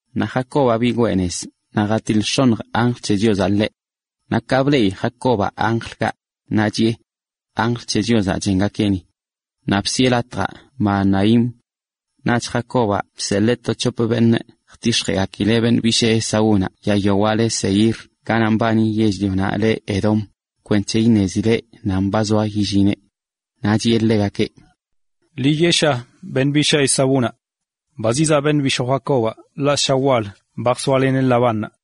Naꞌ Jacobaꞌ bigwee nez naꞌ jatiḻ x̱oṉj anjl c̱he Chiozaꞌ ḻeꞌ. Naꞌ ka bleꞌi Jacobaꞌ anjlkaꞌ, naꞌ wneꞌ: “Anjl c̱he Chiozaꞌ chengakeꞌ ni.” Naꞌ bsiꞌe latjaꞌ Mahanaim. Naꞌch Jacobaꞌ bseḻee to c̱hop beṉꞌ jtix̱jeꞌgakileꞌ beṉꞌ bishee Esaúnaꞌ yaa yawaꞌ le Seir ganaꞌ mbani yell-lionaꞌ le Edom, kwenc̱he iṉezileꞌ nan ba zoa yillineꞌ. Naꞌ chiꞌe ḻegakeꞌ: ―Ḻi yeꞌsha beṉꞌ bishaa Esaúnaꞌ: “Ba zizaꞌ beṉꞌ bishoo Jacobaꞌ ḻaꞌ ssha wal ba jsoaleneꞌ Labánnaꞌ.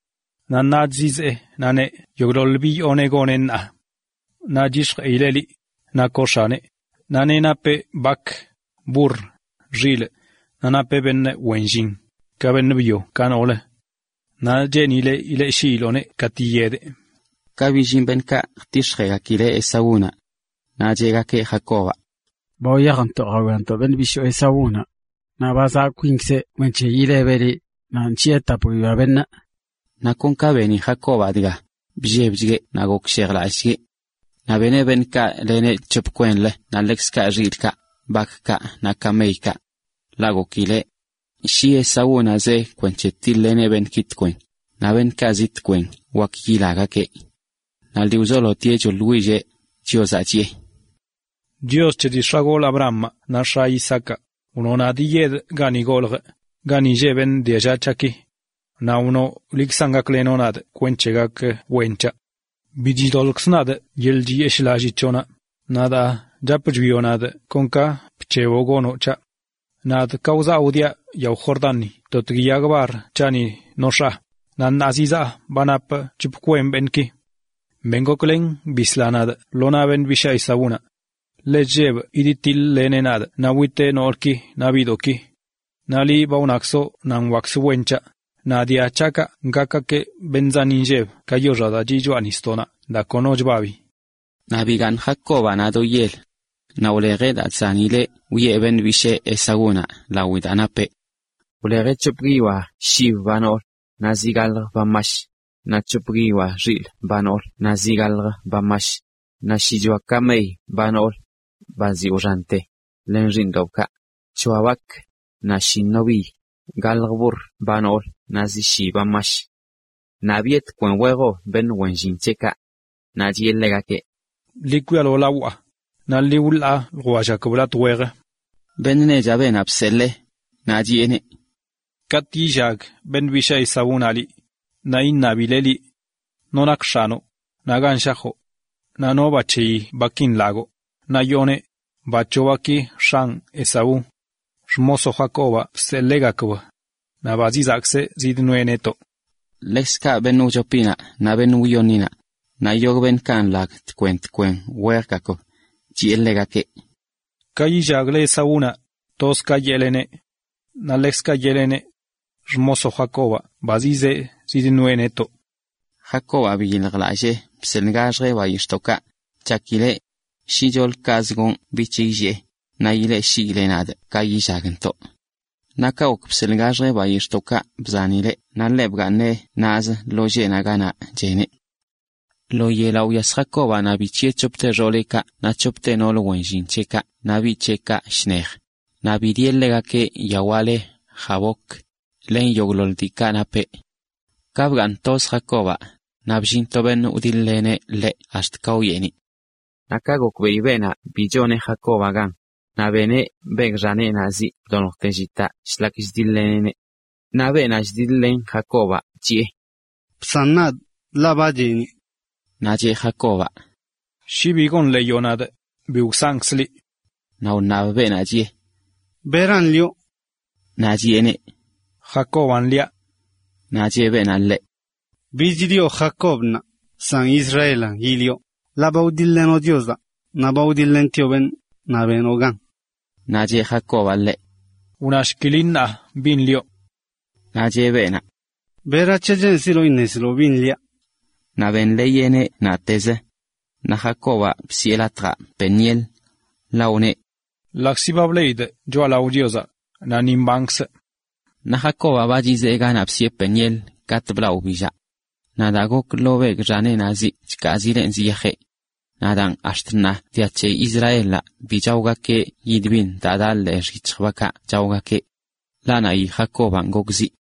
Naꞌ ṉaach zizee naꞌ neꞌ yogꞌḻoḻ bi yooneꞌ goneꞌ ṉaa. Naꞌ c̱hix̱jeꞌileꞌ liꞌ, nakoꞌ x̱aneꞌ, naꞌ neꞌ napeꞌ bak, burr, xilꞌ, naꞌ napeꞌ beṉꞌ wen llin, ka beṉꞌ byo ka noolə. Naꞌ cheenileꞌ ileꞌshiiloꞌneꞌ katꞌ yiyedeꞌ.” Ka billin beṉꞌkaꞌ jtix̱jeꞌgakileꞌ Esaúnaꞌ, naꞌ cheꞌgakeꞌ Jacobaꞌ: ―Ba wyajntoꞌ jawiantoꞌ beṉꞌ bishoo Esaúnaꞌ. Naꞌ ba zaꞌ kwinkzeꞌ kwenc̱he ilebeꞌ liꞌ, naꞌ nc̱hiꞌe tap guiyoa beṉꞌ. Naꞌ kon ka beni Jacobaꞌ dga, bllebchgueꞌ naꞌ gokshejlallꞌchgueꞌ. Naꞌ beneꞌ beṉꞌkaꞌ leneꞌ c̱hop kwenlə naꞌ ḻekzkaꞌ xilꞌkaꞌ, bakkaꞌ, naꞌ kameykaꞌ. Ḻaꞌ gokileꞌ: “Shi Esaúnaꞌ zee kwenc̱he tiḻ-leneꞌ beṉꞌki tkwen, naꞌ beṉꞌkaꞌ zi shkwen wak ilagakeꞌ.” Naꞌ lii wzolotieꞌ choeꞌḻwilleꞌ Chiozaꞌ, chiꞌe: “Chios c̱he dii x̱agolꞌ Abrahamaꞌ naꞌ x̱aꞌ Isaacaꞌ, wnoꞌ nadꞌ yiyedꞌ gani goljꞌ, gani lleꞌ beṉꞌ dialla c̱haꞌki. Naꞌ wnoꞌ liꞌkzan gaklenoꞌ nadꞌ kwenc̱he gak wen c̱haꞌ. Bi chidoḻꞌkzꞌ nadꞌ yeḻꞌ chiyeshꞌlallii c̱hoꞌnaꞌ naꞌ daa chap chwioꞌ nadꞌ kon ka bc̱heboꞌ gonoꞌ c̱haꞌ. Nadꞌ ka wzaa wdiaꞌ yao Jordanni totgui yag bar c̱haꞌni nox̱aa, naꞌ ṉaa zizaa ba napꞌ c̱hop kwen beṉꞌki. Ben goklen bisla nadꞌ lo naꞌ beṉꞌ bishaa Esaúnaꞌ. Ḻe chllebꞌ yidtiḻ-leneꞌ nadꞌ naꞌ witeꞌ noolki naꞌ biꞌdoꞌki. Naꞌ liꞌ ba wnakzoꞌ nadꞌ wakzə wen c̱haꞌ, naꞌ dia c̱haꞌkaꞌ gakgakeꞌ beṉꞌ zan inlleb ka yoxaꞌ daa chiꞌ choꞌa nisdoꞌnaꞌ daa kono chbabi.” Naꞌ bigaaṉ Jacobaꞌ naꞌ do yel. Naꞌ wlejeꞌ daa chzanileꞌ wiꞌe beṉꞌ bishee Esaúnaꞌ lawi daa napeꞌ. Wlejeꞌ c̱hop guiyoa shib ba noolə, naꞌ zi gaḻjə ba mash, naꞌ c̱hop guiyoa xilꞌ ba noolə naꞌ zi gaḻjə ba mash, naꞌ shichoa kamey ba noolə, ba ziꞌ wxante, len xiiṉdoꞌbkaꞌ, c̱hoa bak, naꞌ shi nobiy, gaḻjə burr ba noolə naꞌ zi shi ba mash. Naꞌ biꞌe tkwen wejb beṉꞌ wen llin c̱heꞌkaꞌ. Naꞌ chiꞌe ḻegakeꞌ: ―Ḻi kwialo lawaꞌ, naꞌ ḻi wḻaa ljwellgakb latꞌ wejə. Beṉꞌ nechaꞌ beenaꞌ bseḻee, naꞌ chiꞌeneꞌ: ―Katꞌ yillag beṉꞌ bishaa Esaúnaꞌ liꞌ, naꞌ iṉabileꞌ liꞌ: “¿No nak x̱anoꞌ?” naꞌ “¿Gan shajoꞌ?” naꞌ “¿No ba c̱heyi baki nlagoꞌ?” Naꞌ yooneꞌ: “Ba c̱hoꞌ baki, x̱anꞌ Esaú. Xmosoꞌ Jacobaꞌ bseḻeegakb. Naꞌ ba zizaꞌkzeꞌ zidnoeꞌ netoꞌ.” Ḻekzkaꞌ beṉꞌ wchopinaꞌ, naꞌ beṉꞌ wyoṉinaꞌ, naꞌ yogꞌ beṉꞌkaꞌ nḻag tkwen tkwen wejgakb, chiꞌe ḻegakeꞌ: ―Ka yillagle Esaúnaꞌ, toz ka yeꞌleneꞌ. Naꞌ ḻekzkaꞌ yeꞌleneꞌ: “Xmosoꞌ Jacobaꞌ ba zizee zidnoeꞌ netoꞌ.” Jacobaꞌ biyiljlallee bseḻꞌgaxjeꞌ bayix̱ꞌdoꞌkaꞌ, chakileꞌ: “Shicholə kazə gonꞌ bich illee, naꞌ ileꞌshiileꞌ nadꞌ ka yillagntoꞌ.” Naꞌ ka gok bseḻꞌgaxjeꞌ bayix̱ꞌdoꞌkaꞌ bzanileꞌ, naꞌ ḻeꞌ bgaaṉeꞌ naꞌzə lo lleꞌnaꞌ ganaꞌ cheneꞌ. Lo yelaꞌ wyas Jacobaꞌ naꞌ bic̱hiꞌe c̱hopte xooleꞌkaꞌ naꞌ c̱hopte noolə wen llin c̱heꞌkaꞌ naꞌ biꞌ c̱heꞌkaꞌ shnej, naꞌ bidieꞌ ḻegakeꞌ yawaꞌ le Jaboc, len yogꞌḻoḻ diikaꞌ napeꞌ. Ka bgaaṉ toz Jacobaꞌ, naꞌ bllin to beṉꞌ wdiḻ-leneꞌ ḻeꞌ ax̱t ka wyeeniꞌ. Naꞌ ka gokbeꞌi beenaꞌ bi choneꞌ Jacobaꞌ gan, naꞌ beneꞌ begꞌ xaneꞌnaꞌ ziꞌ bdoljte llitaꞌ shlak chdiḻ-leneꞌneꞌ. Naꞌ beenaꞌ chdiḻ-len Jacobaꞌ chiꞌe: ―Bsan nadꞌ, ḻaꞌ ba cheeniꞌ. Naꞌ cheꞌ Jacobaꞌ: ―Shi bi gonḻeeyoꞌ nadꞌ, bi wsankzꞌ liꞌ. Naꞌ wṉab beenaꞌ, chiꞌe: ―¿Beran lioꞌ? Naꞌ chiꞌeneꞌ: ―Jacobaꞌn liaꞌ. Naꞌ cheꞌ beenaꞌ ḻeꞌ: ―Bich lioꞌ Jacob ṉaa, san Israelan yilioꞌ ṉaa, ḻaꞌ ba wdiḻ-lenoꞌ Chiozaꞌ, naꞌ ba wdiḻ-lentioꞌ beṉꞌ, naꞌ benoꞌ gan. Naꞌ cheꞌ Jacobaꞌ ḻeꞌ: ―Wnashki liꞌ ṉaa, bin lioꞌ. Naꞌ cheꞌ beenaꞌ: ―¿Berac̱he cheenziloꞌ iṉeziloꞌ bin liaꞌ? Naꞌ benḻeeyeꞌneꞌ naꞌtezə. Naꞌ Jacobaꞌ bsiꞌe latjaꞌ Peniel, ḻaꞌ wneꞌ: “Ḻaꞌkzi ba bleꞌidꞌ choꞌalao Chiozaꞌ, naꞌ ni mbankzꞌ.” Naꞌ Jacobaꞌ ba chizee ganaꞌ bsiꞌe Peniel ka blaꞌ wbillaꞌ. Naꞌ daa gok lo begꞌ xaneꞌnaꞌ ziꞌ chkaazileꞌn ziyajeꞌ. Naꞌ daan, ax̱t ṉaa dia c̱he Israelaꞌ bi chaogakeꞌ yid biṉ daa daꞌ ḻee xyic̱hj bakaꞌ chaogakeꞌ. Ḻaꞌ naꞌyi Jacobaꞌn gok ziꞌ.